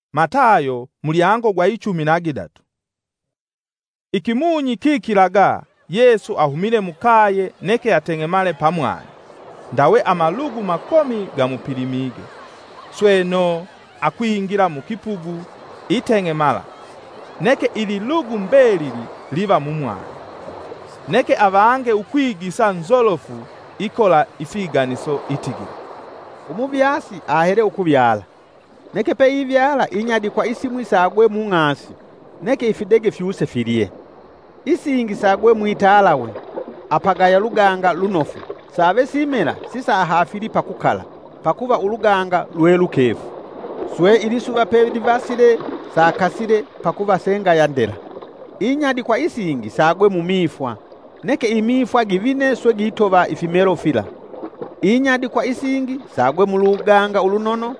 Ikiganiso icha umunyakuvyala. Ikimunyi kikilaga Yesu ahumile mukaye neke ateng'emale pamwani. Ndawe amalugu makomi gamupilimige, sweno akwingila mukipugu iteng'emala; neke ililugu mbelili liva mumwani. Neke avange ukwigisa nzolofu ikola ifiganiso itigila. “Umuvyasi ahele ukuvyala. Neke peivyala, inyadikwa isimwi sagwe mung'asi, neke ifidege fyuse filye. Isingi sagwe mwitalawe, apagaya luganga lunofu save simela sisahafili pakukala, pakuva uluganga lwe lukefu. Swe ilisuva pelivasile sakasile; pakuva sengaya ndela. Inyadikwa isingi sagwe mumifwa neke imifwa givine swe gitova ifimelo fila. Inyadikwa isingi sagwe muluganga ulunono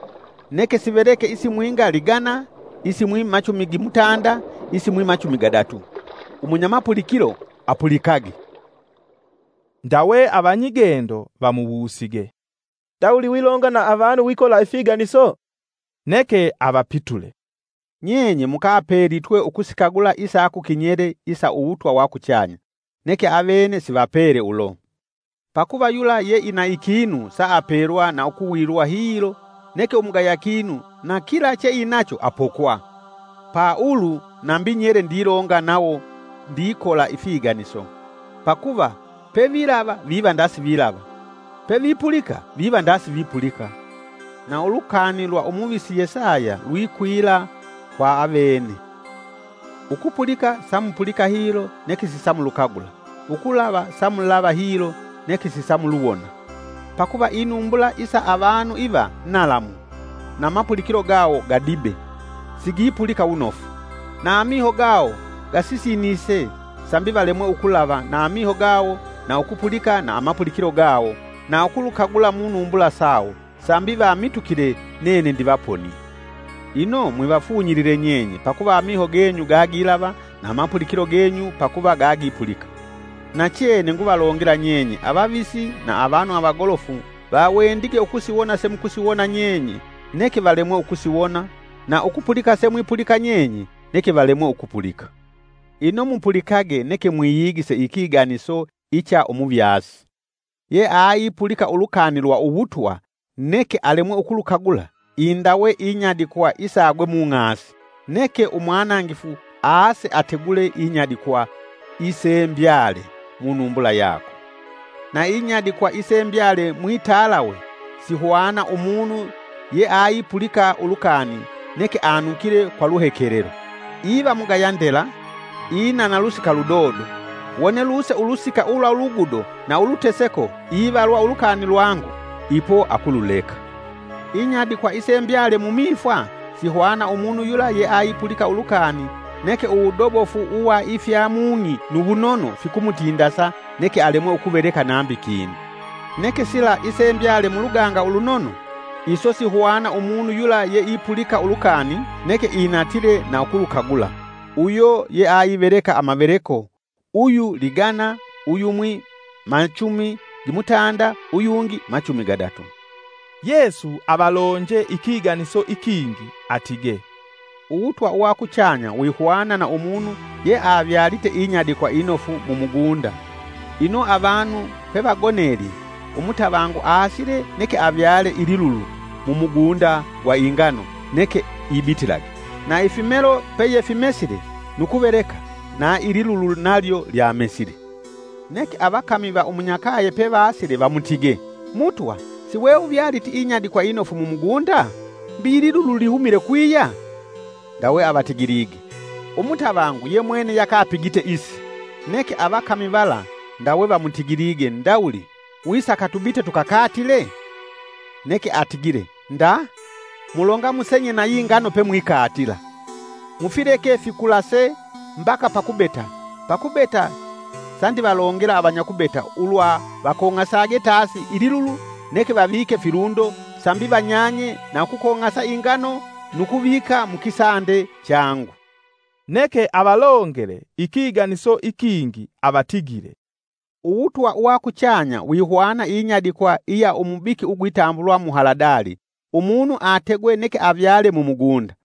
neke siveleke, isimwinga ligana, isimwi machumi gimutanda, isimwi machumi gadatu. Umunya mapulikilo apulikage.” Ndawe avanyigendo vamuwusige, “Ndawuli wilonga na avanu wikola ifiganiso?” Neke avapitule, “Nyenye mukapelitwe usikagula isa kukinyele isa uwutwa wa kuchanya, neke avene sivapele ulo. Pakuva yula ye ina ikinu saapelwa na ukuwilwa hilo neke umugaya kinu nakila che inacho apokwa. Pa ulu nambi nyele ndilonga nawo ndikola ifiganiso, pakuva pevilava viva ndasivilava, pevipulika viva nda sivipulika. Na ulukani lwa umuvisi Yesaya lwikwila kwa avene: ‘Ukupulika samupulika hilo neke sisamulukagula, ukulava samulava hilo neke sisamuluwona. Pakuva inumbula isa avanu iva nalamu, na mapulikilo gawo gadibe sigipulika wunofu, na amiho gawo gasisinise, sambi valemwe ukulava na amiho gawo, na ukupulika na amapulikilo gawo, na ukulukagula munumbula sawo sambi vamitukile nene ndivaponie.’ “Ino mwivafunyilile nyenye pakuva amiho genyu gagilava na amapulikilo genyu pakuva gagipulika. Nachene nguvalongela nyenye, avavisi na avanu avagolofu vawendige ukusiwona semukusiwona nyenye, neke valemwe ukusiwona, na ukupulika semwipulika nyenye, neke valemwe ukupulika. “Ino mupulikage neke mwiyigise ikiganiso icha umuvyasi. Ye aipulika ulukani lwa uwutwa neke alemwe ukulukagula, indawe inyadikwa isagwe mung'asi. Neke umwanangifu aase ategule inyadikwa isembyale munumbula yakwe. Na inyadikwa isembyale mwitalawe sihwana umunu yeaipulika ulukani neke anukile kwa luhekelelo. Iva mugaya ndela, inana lusika ludodo; wone luse ulusika ulwa ulugudo na uluteseko ivalwa ulukani lwangu, ipo akululeka. Inyadikwa isembyale mumifwa, sihwana umunu yula yeaipulika ulukani, neke uwudobofu uwa ifya mung'i nu wunono fikumutindasa neke alemwe ukuveleka nambi kinu. Neke sila isembyale muluganga ulunono, iso sihwana umunu yula yeaipulika ulukani neke inatile na ukulukagula, uyo yeaiveleka amaveleko, uyu ligana, uyumwi machumi gimutanda, uyungi machumi gadatu.” Yesu avalonje ikiganiso ikingi atige, “Uwutwa uwakuchanya wihwana na umunu ye avyalite inyadikwa inofu mumugunda. Ino avanu pevagonelye umutavangu aasile neke avyale ililulu mumugunda gwa ingano neke ibitilage. Na ifimelo peyefimesile nu kuveleka, na ililulu nalyo lyamesile. Neke avakami va umunyakaye pevasile vamutige, ‘Mutwa, siweuvyaliti inyadikwa inofu mumugunda? Mbi ililulu lihumite kwiya?’ Ndawe avatigilige, ‘Umutavangu yemweme yakapigite isi.’ Neke avakami vala ndawe vamutigile ndawuli, ‘Wisaka tubite tukakatile?’ Neke atigile, ‘Nda, mulonga musenye na yingano pemwikatila. Mufileke fikulase mbaka pakubeta, pakubeta sa ndivalongela avanyakubeta, ulwa vakong'asage tasi ililulu neke vavike filundo sambi vanyanye na ukukong'asa ingano nu kuvika mukisande changu.’” Neke avalongele ikiganiso ikingi avatigile, “Uwutwa uwa kuchanya wihwana inyadikwa iya umubiki ugwitambulwa muhaladali, umunu ategwe neke avyale mumugunda.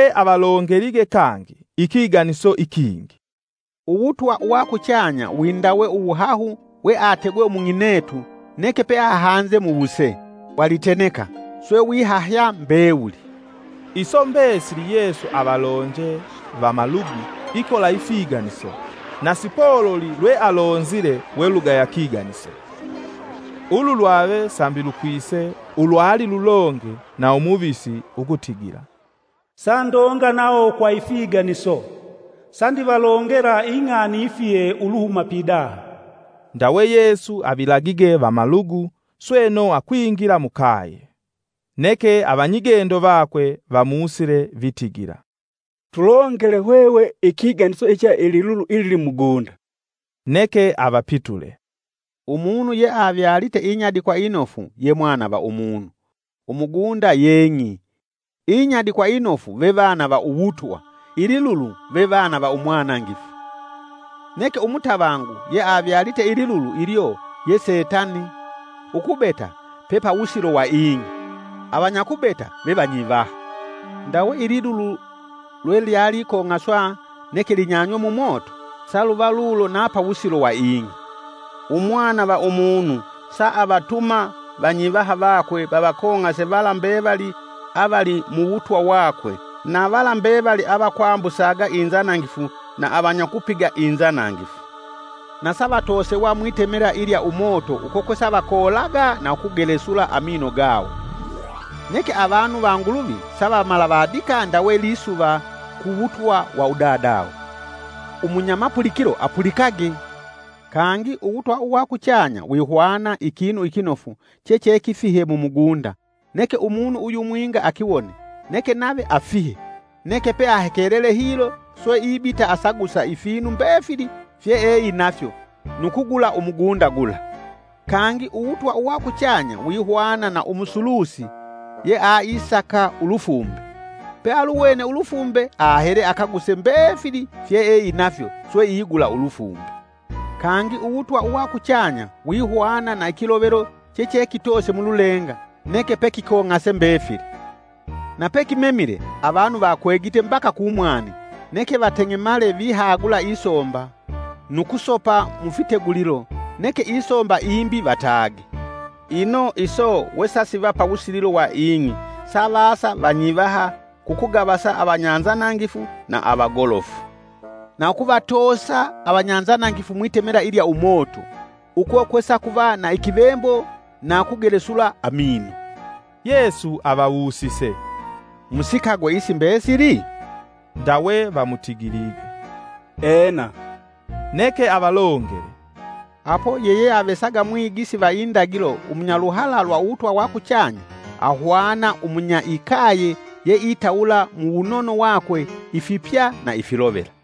Ndawe avalongelige kangi ikiganiso ikingi: “Uwutwa uwa kuchanya wi ndawe uwuhahu we ategwe umung'inetu neke peahanze muwuse wa liteneka, swe wihahya mbewuli.” Iso mbesili Yesu avalonje vamalugu ikola ifiganiso, na sipololi lwe alonzile welugaya kiganiso. Ulu lwave sambi lukwise ulwali lulonge na umuvisi ukutigila: “Sandonga nawo kwa ifiganiso, sandivalongela ing'ani ifihe uluhuma pidaha.” Ndawe Yesu avilagige vamalugu sweno akwingila mukaye. Neke avanyigendo vakwe vamusile vitigila, “Tulongele hwehwe ikiganiso icha ililulu ilili mumugunda” Neke avapitule, “Umunu yeavyalite inyadikwa inofu ye mwana va umunu. Umugunda ye ng'i, inyadikwa inofu vevana va uwutwa; ililulu vevana va umwanangifu. Neke umutavangu yeavyalite ililulu ilyo ye setani; ukubeta pepawusilo wa ing'i, avanyakubeta ve vanyivaha. Ndawe ililulu lwelyalikong'aswa neke linyanywe mu moto, saluva lulo na pawusilo wa ing'i. Umwana va umunu sa alatuma vanyivaha vakwe vavakong'ase vala mbevali avali muwutwa wakwe na vala mbevali avakwambusaga inzanangifu na avanyakupiga inzanangifu. Na savatosewa mwitemela ilya umoto uko kwesavakoolaga na ukugelesula amino gawo. Neke avanu va Nguluvi savamalavadika ndawe lisuva ku wutwa wa Udadawo. Umunya mapulikilo apulikage! “Kangi uwutwa uwakuchanya wihwana ikinu ikinofu chechekifihe mumugunda, neke umunu uyumwinga akiwone neke nave afihe neke peahekelele hilo swe ibita asagusa ifinu mbefili fyeeinafyo nu kugula umugunda gula. “Kangi uwutwa uwa kuchanya wihwana na umusulusi yeaisaka ulufumbe. Pe aluwene ulufumbe, ahele akaguse mbefili fyeeinafyo swe igula ulufumbe. “Kangi uwutwa uwa kuchanya wihwana na ikilovelo che chekitoose mululenga neke pe kikong'ase mbefili. Nape kimemile, avanu vakwegite mbaka kumwani, neke vateng'emale vihagula isomba nu kusopa mufitegulilo neke isomba imbi vatage. Ino iso we sasiva pawusililo wa ing'i savasa vanyivaha kukugavasa avanyanzanangifu na avagolofu. Na ukuvatoosa avanyanzanangifu mwitemela ilya umoto; uko kwesakuva na ikivembo na ukugelesula amino.” Yesu avawusise, “Musikagwe isi mbesili?” Ndawe vamutigilige, “Ena.” Neke avalongele, “Apo yeyeavesaga mwigisi va indagilo umunyaluhala lwa uwutwa wa kuchanya ahwana umunya ikaye yeitawula mu wunono wakwe ifipya na ifilovela.”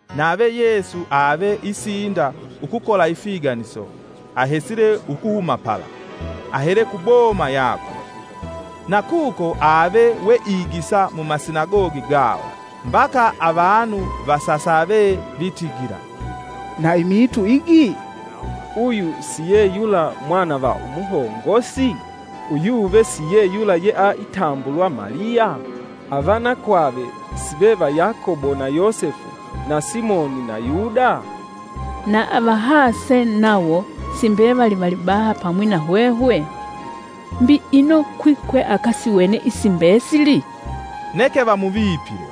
Nave Yesu ave isinda ukukola ifiganiso, ahesile ukuhuma pala, ahele kuboma yakwe. Na kuko ave weigisa mumasinagogi gawo, mbaka avanu vasasave vitigila, “Na imiitu igi? Uyu si ye yula mwana va umuhongosi? Uyuve siye yula yea itambulwa Maliya? Avanakwave si ve va Yakobo na Yosefu, na Simoni na Yuda? Na avahase nawo si mbevali valibaha pamwi na hwehwe? Mbi ino kwi kwe akasiwene isi mbesili?” Neke vamuvipile.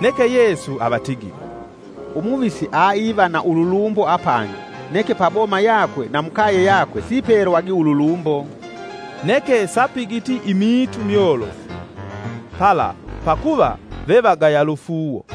Neke Yesu avatigile, “Umuvisi aiva ululumbo apangi neke pa boma yakwe na mukaye yakwe sipelwagi ululumbo!” Neke sapigiti imiitu myolofu, pala pakuva vevagaya lufuuwo.